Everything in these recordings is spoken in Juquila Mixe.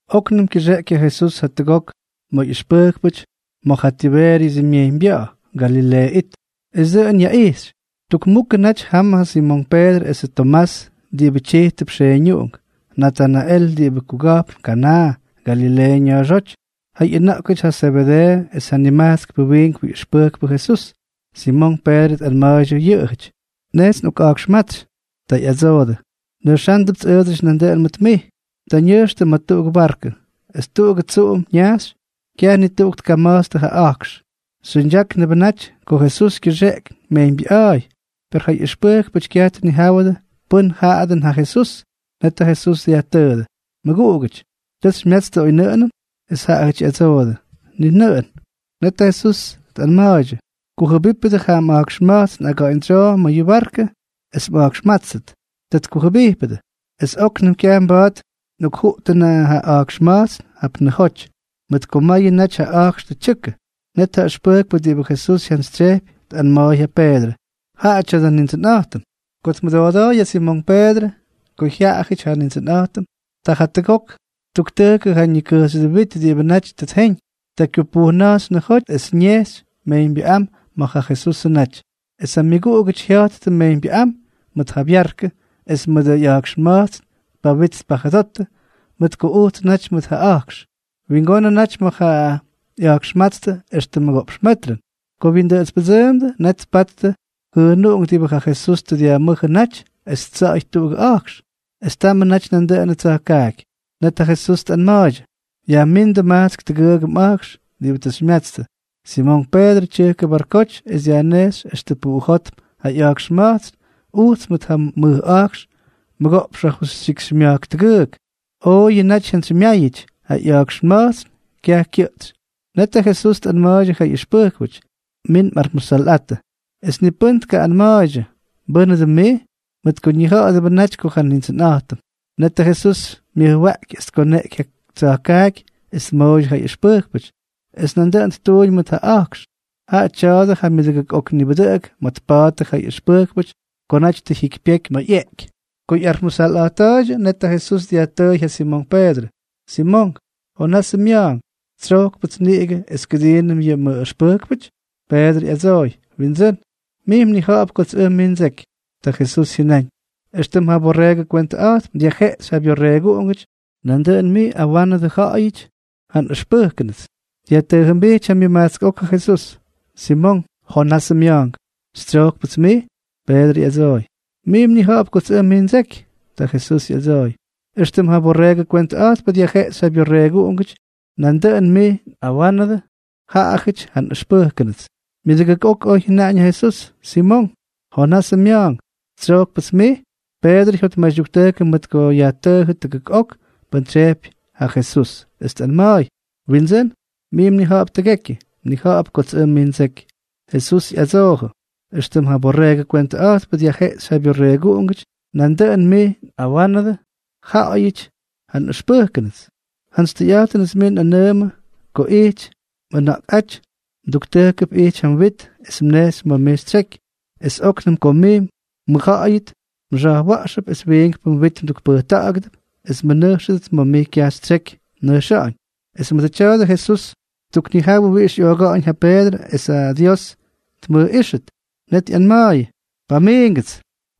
Oknʉm kyʉxeꞌky ja Jesús jatʉgok ma̱ ꞌyʉxpʉjkpʉty ma̱ ja Tibeeryʉs Myejyñbya̱ꞌa̱, Galileeʉ it. Es dʉꞌʉn yaꞌijxy: Tukmukʉ naty jam ja Simonk Peedrʉ esʉ Tomás diꞌibʉ tyijtʉp Xeeñuꞌunk, Natanael diꞌibʉ kuga̱jpn Kanaa, Galileeʉ ña̱a̱xóty, ja ꞌyʉna̱ꞌkʉty ja Zebedeeʉ es janimajtskpʉ wiinkpʉ ꞌyʉxpʉjkpʉ Jesús. Simonk Peedrʉ tꞌanma̱a̱ydyʉ yʉꞌʉjʉty: —Nejts nꞌokꞌa̱jkxmátsy. Ta ꞌyadsoodʉ: —Nʉjxándʉpts ʉʉdsʉty nandʉꞌʉn mʉt mij. Ta ñʉjxtʉ ma̱ tuꞌugʉ barkʉ. Es tuꞌugʉ tsuꞌum ñajxy, kyaj ni tuꞌuk tkama̱jtstʉ ja a̱jkx. Xʉʉñdyáknʉbʉ naty ko Jesús kyʉxeꞌky mejyñbyʉꞌa̱a̱y, per ja ꞌyʉxpʉjkpʉty kyaj tnijáwʉdʉ pʉ́n jaꞌa dʉn ja Jesús. Net ja Jesús dyajtʉʉdʉ: —Mʉguꞌugʉty, ¿tʉ xymyatstʉ oynʉꞌʉnʉn? Es jaꞌajʉty ꞌyadsoodʉ: —Ni nʉꞌʉn. Net ja Jesús tꞌanma̱a̱ydyʉ: —Kujʉbípʉdʉ ja mꞌa̱jkxma̱jtsn aga̱ꞌa̱ñdsyoo ma̱ yʉ barkʉ, es mꞌa̱jkxmátstʉt. Ta tkujʉbijpʉdʉ, es óknʉm kyaj mba̱a̱t tꞌokjuꞌtnʉdʉ ja ꞌya̱jkxma̱jtsn jap nʉjoty, mʉt ko mayʉ naty ja a̱jkx tʉ tyʉkʉ. Net ja ʉxpʉjkpʉ diꞌibʉ Jesús jyantsytsyejpy, tꞌanma̱a̱y ja Peedrʉ: —¡Jaꞌa tya̱a̱dʉ ja Nindsʉnꞌa̱jtʉm! Ko tmʉdooda̱a̱y ja Simonk Peedrʉ ko jyaꞌajʉty ja Nindsʉnꞌa̱jtʉm, ta jatʉgok ttuktʉjkʉ ja ñikʉjxyʉdʉ wit diꞌibʉ naty tʉ tjeñ. Ta kyupujpna̱jxy nʉjoty es ñejxy mejyñbyʉꞌám ma̱ ja Jesusʉ naty. Es ja myʉguꞌugʉty jya̱jttʉ mejyñbyʉꞌám mʉt ja byarkʉ es mʉdʉ ꞌya̱jkxma̱jtsn tpawits tpajʉdottʉ, mʉt ko ujtsʉ naty mʉt ja a̱jkx. Wingonʉ naty ma̱ ja ꞌya̱jkxmátstʉ éxtʉm mʉgoꞌpx metrʉn. Ko wyindʉꞌʉtspʉdsʉʉmdʉ, net tpattʉ jʉʉnuꞌunk diꞌibʉ ja Jesús tʉ dyajmʉ́jʉ naty es ttsa̱a̱y tuꞌugʉ a̱jkx, es tamʉ naty nandʉꞌʉnʉ tsa̱jkaaky. Net ja Jesús tꞌanma̱a̱ydyʉ: —Yajmíndʉ majtsk tʉgʉʉgʉ mꞌa̱jkx diꞌibʉ tʉ xymyatstʉ. Simonk Peedrʉ tyʉjkʉ barkoty es dyajnejxy extʉ puꞌujótm ja ꞌya̱jkxma̱jtsn ujts mʉt ja mʉj a̱jkx mʉgoꞌpx jajustyikxymya̱jk tʉgʉʉk. Oyʉ naty jyantsymyáyʉty, ja ꞌya̱jkxma̱jtsn kyaj kyʉꞌtsy. Net ja Jesús tꞌanma̱a̱ydyʉ ja ꞌyʉxpʉjkpʉty: —Min mꞌarmusalꞌattʉ. Es ni pʉ́n tkaꞌꞌanma̱a̱ydyʉ: “¿Mbʉ́nʉ dʉn mij?”, mʉt ko ñija̱ꞌa̱dʉbʉ naty ko jaꞌa ja Nindsʉnꞌa̱jtʉm. Netʉ Jesús myʉjwaꞌky es tkoneꞌky ja tsa̱jkaaky es tmooydyʉ ja ꞌyʉxpʉjkpʉty. Es nandʉꞌʉn ttuuñ mʉt ja a̱jkx. Jaꞌa tya̱a̱dʉ ja myʉdʉgʉk ok nibʉdʉꞌʉk ma̱ tpa̱a̱ttʉ ja ꞌyʉxpʉjkpʉty ko naty tʉ jyikypyeky ma̱ ꞌyeꞌky. Ko ꞌyarmusalꞌa̱jtta̱a̱ydyʉ, net ja Jesús dyajtʉʉy ja Simonk Peedrʉ: —Simonk, Jonasʉ mya̱a̱nk, ¿xytsyojkpʉts niꞌigʉ es kʉdiinʉm yʉ mmʉꞌꞌʉxpʉjkpʉty? Peedrʉ ꞌyadsooy: —Windsʉ́n, mij mnija̱ꞌa̱p kots ʉj mij ndseky. Ta Jesús jyʉnáñ: —Extʉm ja borreegʉ kwentʉꞌa̱jtpʉ dyajjeꞌxy ja byorreeguꞌungʉty, nandʉꞌʉn mij awánʉdʉ ja̱ꞌa̱yʉty ja nꞌʉxpʉjkʉnʉts. Dyajtʉʉjʉmbijty ja myʉmajtsk ok ja Jesús: —Simonk, Jonasʉ mya̱a̱nk, ¿xytsyojkpʉts mij? Peedrʉ ꞌyadsooy: —Mij mnija̱ꞌa̱p kots ʉj mij ndseky. Ta Jesús ꞌyadsooy: —Extʉm ja borreegʉ kwentʉꞌa̱jtpʉ dyajjeꞌxy ja byorreeguꞌungʉty, nandʉꞌʉn mij awánʉdʉ ja̱ꞌa̱yʉty ja nꞌʉxpʉjkʉnʉts. Myʉdʉgʉk ok jyʉnáñ ja Jesús: —Simonk, Jonasʉ mya̱a̱nk, ¿xytsyojkpʉts mij? Peedrʉ jyotmaydyuktʉjkʉ mʉt ko yajtʉʉjʉ tʉgʉk ok pʉn tsyejpy ja Jesús, es tꞌanma̱a̱y: —Windsʉ́n, mij mnija̱ꞌa̱p tʉgekyʉ. Mnija̱ꞌa̱p kots ʉj mij ndseky. Jesús ꞌyadsoojʉ: —Extʉm ja borreegʉ kwentʉꞌa̱jtpʉ dyajjeꞌxy ja byorreeguꞌungʉty, nandʉꞌʉn mij awánʉdʉ ja̱ꞌa̱yʉty ja nꞌʉxpʉjkʉnʉts. Jantsy tʉyꞌa̱jtʉnʉts mij nꞌanʉʉmʉ ko ijty mꞌʉna̱ꞌkꞌáty, mduktʉjkʉp ijty ja mwit es mnejxy ma̱ mij xytsyeky. Es óknʉm ko mij mmʉjja̱ꞌa̱yʉt, mxa̱jwa̱ꞌxʉp es wiinkpʉ mwit mdukpʉjta̱ꞌa̱gʉdʉp, es mmʉnʉjxʉdʉt ma̱ mij kyaj xytsyeky mnʉjxa̱ꞌa̱ñ. Es mʉdʉ tya̱a̱dʉ Jesús ttuknijawʉ wiꞌix ꞌyoogáñ ja Peedrʉ es ja Dios tmʉjꞌíxʉt. Net ꞌyanma̱a̱yʉ: —Pamiingʉts.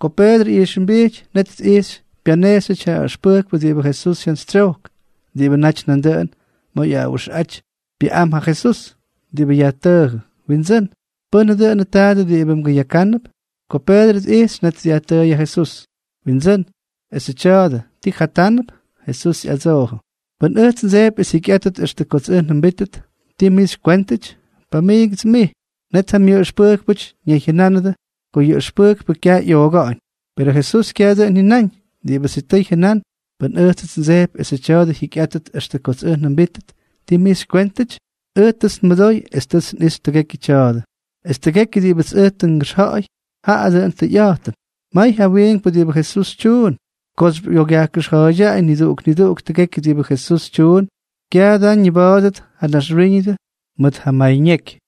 Ko Peedrʉ ꞌyijxʉmbijty, net tꞌijxy pyanejxyʉty ja ʉxpʉjkpʉ diꞌibʉ Jesús jyantsytsyojk, diꞌibʉ naty nandʉꞌʉn ma̱ ꞌyaꞌuxꞌaty pyʉꞌam ja Jesús, diꞌibʉ yajtʉʉjʉ: “Windsʉ́n, ¿pʉ́nʉ dʉnʉ tadʉ diꞌibʉ mgʉyakánʉp?” Ko Peedrʉ tꞌijxy, net dyajtʉʉy ja Jesús: —Windsʉ́n, esʉ tya̱a̱dʉ, ¿ti jatánʉp? Jesús ꞌyadsoojʉ: —Pʉn ʉjts ndsejpy es jyikyꞌátʉt extʉ kots ʉj njʉmbítʉt, ¿ti mij xykywéntʉty? Pamiingʉts mij. Net ja myʉꞌꞌʉxpʉjkpʉty ñayjyʉnánʉdʉ ko yʉ ʉxpʉjkpʉ kyaj ꞌyooga̱ꞌa̱ñ. Perʉ Jesús kyaj dʉꞌʉn jyʉnáñ, diꞌibʉ sitʉy jʉnán: “Pʉn ʉjtsʉts ndsejpy esʉ tya̱a̱dʉ jyikyꞌátʉt extʉ kots ʉj njʉmbítʉt, ¿ti mij xykywéntʉty?” Ʉj tʉts nmʉdoy es tʉts nꞌixy tʉgekyʉ tya̱a̱dʉ, es tʉgekyʉ diꞌibʉts ʉj tʉ ngʉxja̱ꞌa̱y, jaꞌa dʉꞌʉn tʉyꞌa̱jtʉn. May ja wiinkpʉ diꞌibʉ Jesús tyuun. Kooxyʉp yajkʉxja̱a̱ydyaay niduꞌuk niduꞌuk tʉgekyʉ diꞌibʉ Jesús tyuun, kyajʉ da ñiba̱a̱dʉt ja naxwíñʉdʉ mʉt ja mayñeky.